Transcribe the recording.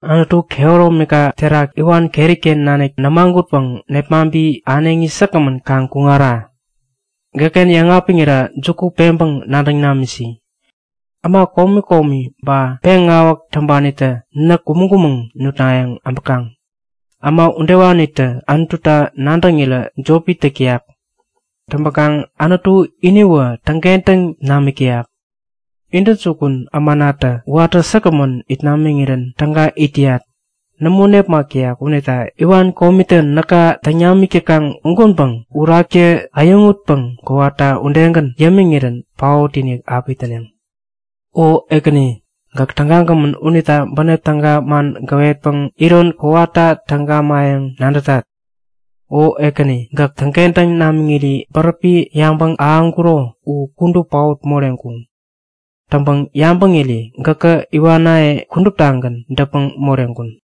Anutu, kehäromika terak iwan keriken nanik nämagutpäŋ nepmaŋpi äneŋi säkgämän kaŋ kuŋara. Gäkken yäŋapiŋira juku peŋpäŋ nadäŋ namisi. Äma komi komi ba peŋawäk täŋpanitä näk kumäŋ-kumäŋ nutnayäŋ äbäkaŋ. Äma udewanitä Anututa nadäŋirä jopi täk täyak. Täŋpäkaŋ Anutu iniwä täŋkentäŋ namik täyak. Intäjukun ämanatä watä säkgämän it namiŋirän täga it täyat. Nämo nepmak täyak unita iwan komitä näka täŋ namik täkaŋ ugänpäŋ Uraktä äyäŋutpäŋ kowata udegän yämiŋirän paot-inik api täneŋ. O Ekäni, gäk tägagämän unita bänep täga man gäwetpäŋ iron kowata täŋ gamayäŋ nadätat. O Ekäni, gäk täŋkentäŋ namiŋiri bäräpi yabäŋ ahäŋkuro u kudup paot moreŋkuŋ. Täŋpäŋ yabäŋira gäkä iwanaye kuduptagän däpmäŋ moreŋkun.